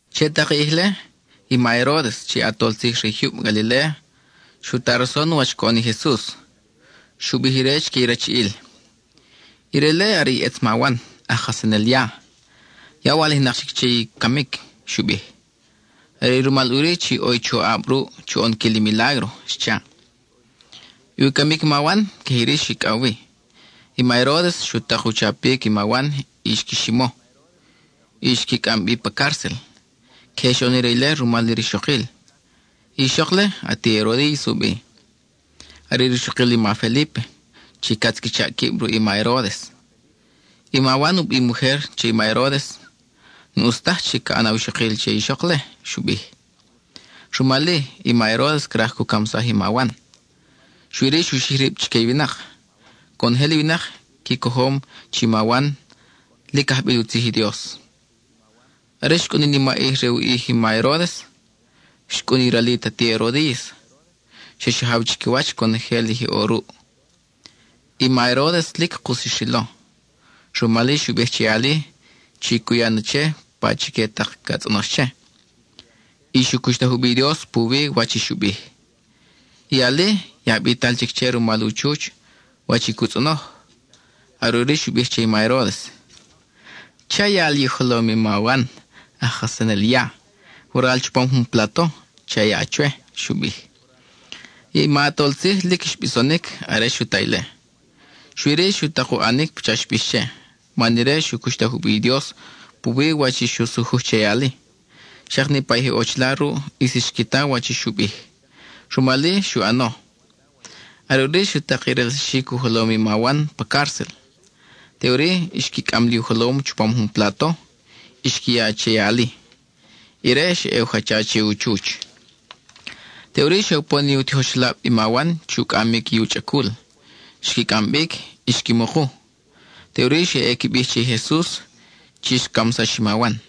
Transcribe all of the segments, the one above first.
Che tak i ʼij-le, i ma Heródes, chi ʼatol tzij re i jyub Galiléa, xu ta rason wach coʼon i Jesus. Xu bij ire chique i rachiʼil: —Ire-le, are i ʼetz ma Wan, aj kajsanel ya, ya walijnak chic che i camic —xu bij—. Are i rumal ʼuri chi ʼo i choʼab ruʼ chu ʼonquil i milágro —xcha. I u camic i ma Wan, queje iri xicʼaw wi: i ma Heródes xu tak u chapic i ma Wan y xqui ximo, y xqui cʼam bi pa cárcel. Queje xoʼon ire ile rumal i rixokil. I ixok-le, ati Erodiys u bi, are i rixokil i ma Felípe chi catz qui chaʼ quib ruʼ i ma Heródes. I ma Wan u bim ujer che i ma Heródes: —N-ʼus taj chi ca ʼan awixokil che i ixok-le —xu bij. Rumal-i, i ma Heródes craj cu camsaj i ma Wan, xui-ri xu xij rib chique i winak. Conojel i winak qui cojom chi i ma Wan lic ajbil u tzij i Dios. Are xcʼun i nimaʼij re u ʼij i ma Heródes, xcʼun i ralit i ati Erodiys, xa xajaw chiquiwach conojel i je ʼo ruʼ. I ma Heródes lic kus xrilo. Rumal-i xu bij che i ali chi cu ya na che pachique tak ca tzʼonox che, y xu cuxtaj u bi i Dios puwi wach i xu bij. I ali, ya bital chic che rumal u chuch wach i cu tzʼonoj; are ʼuri xu bij che i ma Heródes: —Cha ya li u jolom i ma Wan aj kajsanel ya; waral chupam jun plato cha ya chwe —xu bij. I ma ʼatol tzij lic xbisonic are xu ta ile. Xui-ri, xu tak u ʼanic pacha xbix che, man ire xu cuxtaj u bi i Dios puwi wach i xu sujuj che i ali. Xak niʼpa i je ʼo chila ruʼ ʼis xqui ta wach i xu bij; rumal-i, xu ʼano. Are ʼuri xu tak i relsaxic u jolom i ma Wan pa cárcel. Teʼuri xqui cʼam li u jolom chupam jun plato, y xqui ya che i ali; ire xa ʼe u jacha che u chuch. Teʼuri xe upon i u tijoxelab i ma Wan chu cʼamic i u chʼacul; xqui cʼam bic y xqui muku. Teʼuri xe ʼe qui bij che i Jesus chi xcamsax i ma Wan.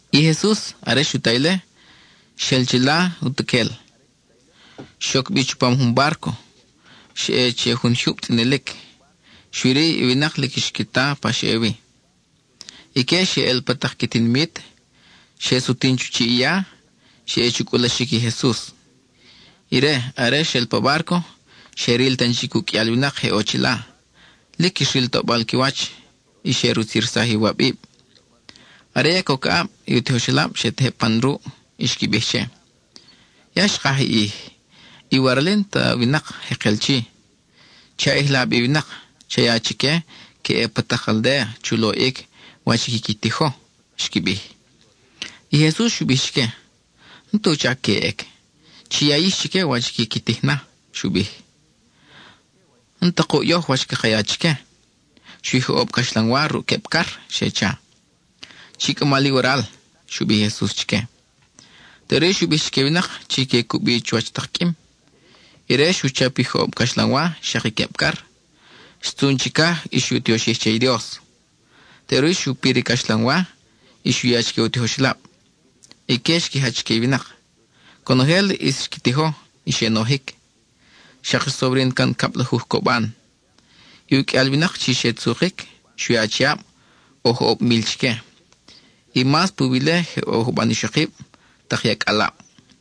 I Jesus, are xu ta ile, xel chila utuquel. Xoc bi chupam jun bárco, xa ʼe che jun jyub tzʼinilic. Xui-ri, i winak lic xqui ta pa xa ʼe wi. Ique xe ʼel pa tak qui tinimit, xe sutin chu chiʼ i ya, xe ʼe chu cʼulaxic i Jesus. Ire, are xel pa bárco, xe ril tan chic uqʼuial winak je ʼo chila. Lic xril toʼbal qui wach, y xe rutzirsaj i iwabib. Are ya coc aʼab, i u tijoxelab xe tejeb pan ruʼ y xqui bij che: —Ya xkaj i ʼij; i waral-i n-ta winak jekel chi. Che a ʼijla bi i winak; cha ya chique que ʼe pa tak aldéa chu loʼic wach i quiqui tijo —xqui bij. I Jesus xu bij chique: —N-tu chac que ʼec; chi ya yix chique wach quiqui tij na —xu bij. —N-ta kuʼ yoj wach caka ya chique; xui joʼob caxlanwa ruʼ queb car —xe cha. —Chi cʼama li waral —xu bij i Jesus chique. Teʼuri xu bij chique i winak chi que cubi chuwach tak qʼuim. Ire xu chap i joʼob caxlanwa xak i queb car, xtzun chicaj y xu tioxij che i Dios. Teʼuri xu pir i caxlanwa y xu ya chique u tijoxelab; ique xqui jach chique i winak. Conojel ʼis xqui tijo, y xe nojic. Xak xsobrin can cablajuj coban. I uqʼuial winak chi xe tzukic, xui achiab ʼo joʼob mil chique, y mas puwi ile je ʼo juban ixokib, tak i acʼalab.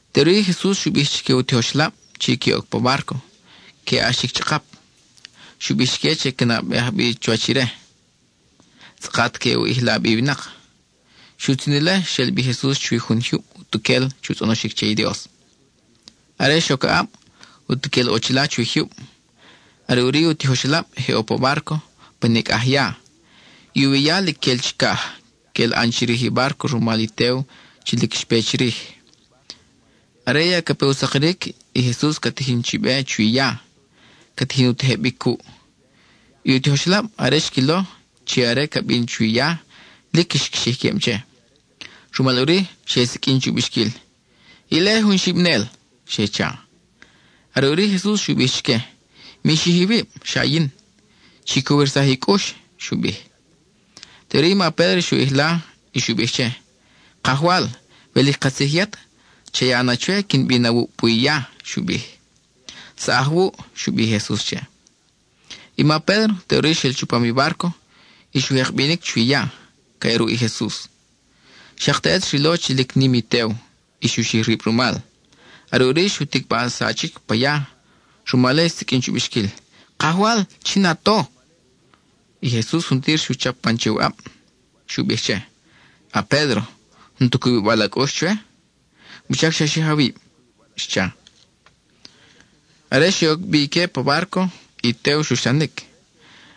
Teʼuri Jesus xu bij chique u tijoxelab chi que oc pa bárco, que ʼax chic chʼakap. Xu bij chique que nabeaj nubi chuwach ire, tzʼakat que u ʼijla bi i winak. Xutzin ile, xel bi Jesus chuwi jun jyub utuquel chu tzʼonoxic che i Dios. Are xoc aʼab, utuquel ʼo chila chuwi jyub. Are ʼuri i u tijoxelab je ʼo pa bárco pa nicʼaj ya. I uwi ya lic quel chicaj, quel ʼan chirij i bárco rumal i tew chi lic xpe chirij. Are ya ca pe u sakiric, i Jesus ca tijin chi be chuwi ya, ca tijin u tejebic cuʼ. I u tijoxelab, are xquilo chi ire ca bin chuwi ya, lic xqui xij quib che. Rumal ʼuri, xe siqʼuin chu bixquil: —¡Ile, jun xibinel! —xe cha. Are ʼuri i Jesus xu bij chique: —¡Mi xij iwib! Xa yin. ¡Chi cowirsaj i cʼux! Teʼuri i ma Pédro xu ʼijla y xu bij che: —Kajwal, we lic katzij yet, cha ya na chwe quin bin awuʼ puwi i ya —xu bij. —Saʼaj wuʼ —xu bij i Jesus che. I ma Pédro teʼuri xel chupam i bárco y xu jek bi binic chuwi ya, ca ʼe ruʼ i Jesus. Xak teʼet xrilo chi lic nim i tew, y xu xij rib rumal. Are ʼuri xu ticba sachic pa ya; rumal-i, xsiqʼuin chu bixquil: —¡Kajwal, chin a to! I Jesus juntir xu chap pan che u ʼab. Xu bij che: —A-Pédro, ¿n-tu cubibal a cʼux chwe? ¿Wuchac xa xij awib? —xcha. Are xe oc bi ique pa bárco, i tew xuxlanic.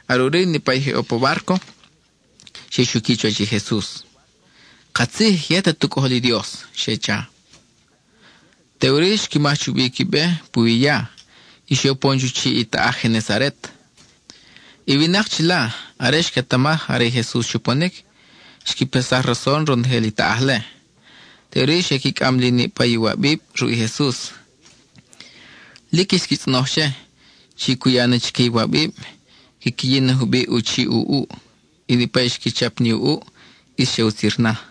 Are ʼuri niʼpa i je ʼo pa bárco, xe xuqui chuwach i Jesus. —Katzij yet at u Cʼojol i Dios —xe cha. Teʼuri xqui maj chubi qui be puwi ya, y xe upon chu chiʼ i taʼaj Genesaret. I winak chila, are xquetamaj are i Jesus xuponic, xqui paxsaj rason ronojel i taʼaj-le. Teʼuri xe qui cʼam li niʼpa i iwabib ruʼ i Jesus. Lic xqui tzʼonoj che, chi cu ya na chique i iwabib quiqui yin na jubiʼ u chiʼ u ʼuʼ; y niʼpa i xqui chap ni u ʼuʼ, ʼis xe utzir na.